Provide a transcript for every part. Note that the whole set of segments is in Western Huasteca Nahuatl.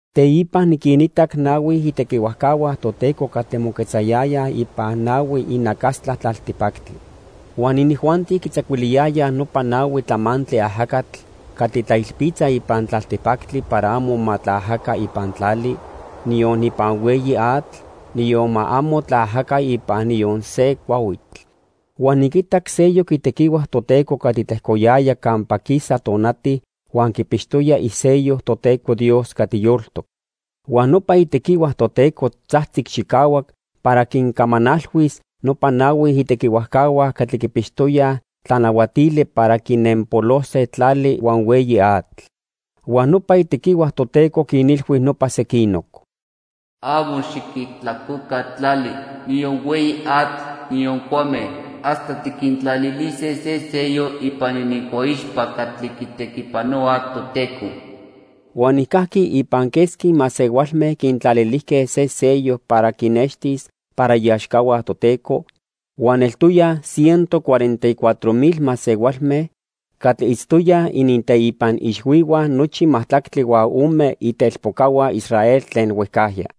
Teipa niquinitac nahui itequihuajcahua Toteco catli moquetzayayaj ipan nahui inacastla tlaltipactli. Huan inijuanti quitzacuiliyayaj nopa nahui tlamantli ajacatl catli tlailpitza ipan tlaltipactli para amo ma tlaajaca ipan tlali, niyon ipan hueyi atl, niyon ma amo tlaajaca ipan niyon se cuahuitl. Huan niquitac seyoc itequihua Toteco catli tlejcoyaya campa quisa tonati huan quipixtoya isello Toteco Dios catli yoltoc. Huan nopa itequihua Toteco tzajtzic chicahuac para quincamanalhuis nopa nahui itequihuajcahua catli quipixtoyaj tlanahuatili para quinenpolose tlali huan hueyi atl. Huan nopa itequihua Toteco quinilhui nopa sequinoc: "Amo xiquijtlacoca tlali, niyon hueyi atl, niyon cuame, hasta tiquintlalilise se sello ipan inincuaixpa catli quitequipanohuaj Toteco." Huan nijcajqui ipan quesqui masehualme quintlalilijque se sello para quinextis para iaxcahua Toteco huan eltoyaj ciento cuarenta y cuatro mil masehualme catli itztoyaj ininteipan ixhuihua nochi majtlactli huan ome itelpocahua Israel tlen huejcajya.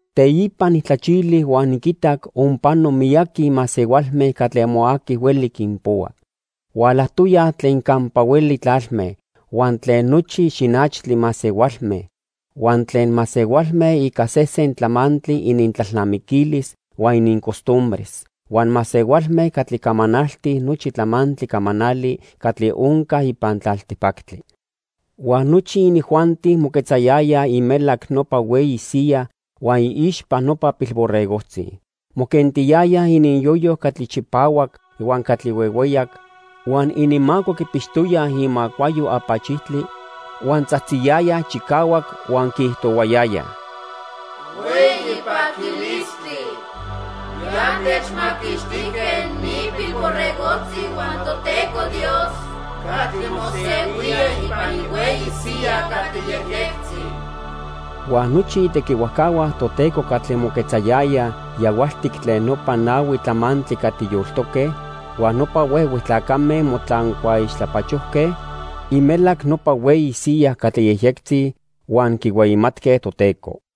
Teipa nijtlachili huan niquitac onpano miyaqui masehualme catli amo aqui hueli quinpohua. Hualajtoyaj tlen campa hueli tlalme, huan tlen nochi xinachtli masehualme, huan tlen masehualme ica sesen tlamantli inintlalnamiquilis huan inincostumbres, huan masehualme catli camanaltij nochi tlamantli camanali catli onca ipan tlaltipactli. Huan nochi inijuanti moquetzayayaj imelac nopa hueyi siya huan iixpa nopa Pilborregojtzi. Moquentiyayaj ininyoyo catli chipahuac huan catli huehueyac huan ininmaco quipixtoyaj imacuayo apachijtli, huan tzajtziyayaj chicahuac huan quiijtohuayayaj: "¡Hueyi paquilistli! Ya techmaquixtijque ni Pilborregojtzi huan Toteco Dios catli mosehuía ipan ihueyi siya catli yejyectzi." Huan nochi itequihuajcahua Toteco catli moquetzayayaj yahualtic tlen nopa nahui tlamantli catli yoltoque huan nopa huehue tlacame motlancuaixtlapachojque imelac nopa hueyi siya catli yejyectzi huan quihueyimatque Toteco.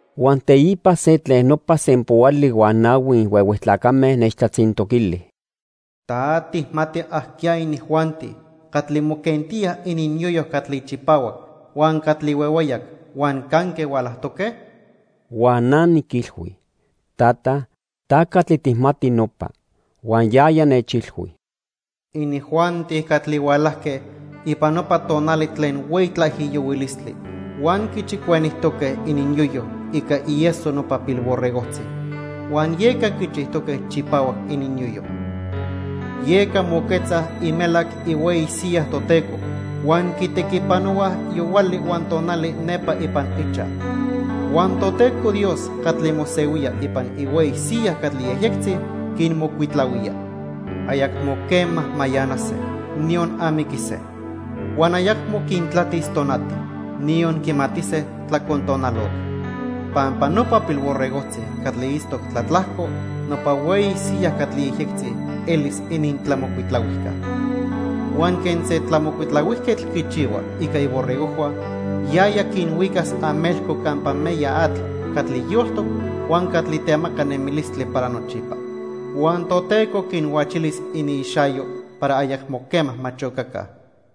Huan teipa se tlen nopa sempoali huan nahui huehue tlacame nechtlatzintoquili: "¿Ta tijmati ajqueya inijuanti catli moquentíaj ininyoyo catli chipahuac huan catli huehueyac, huan canque hualajtoque?" Huan na niquilhui: "Tata, ta catli tijmati nopa." Huan yaya nechilhui: "Inijuanti catli hualajque ipan nopa tonali tlen hueyi tlaijiyohuilistli huan quichicuenijtoque ininyoyo ica ieso nopa Pilborregojtzi, huan yeca quichijtoque chipahuac ininyoyo. "Yeca moquetzaj imelac ihueyi siya Toteco huan quitequipanohuaj yohuali huan tonali nepa ipan ichaj. Huan Toteco Dios catli mosehuía ipan ihueyi siya catli yejyectzi quinmocuitlahuía. Ayacmo quema mayanase, niyon amiquise. Huan ayacmo quintlatis tonati, niyon quimatise tlacontonalotl. Pampa nopa Pilborregojtzi catli itztoc tlatlajco nopa hueyi siya catli yejyectzi elis inintlamocuitlahuijca. Huan quen se tlamocuitlahuijquetl quichihua ica iborregojhua, yaya quinhuicas amelco campa meya atl catli yoltoc huan catli temaca nemilistli para nochipa. Huan Toteco quinhuachilis iniixayo para ayacmo quema ma chocaca."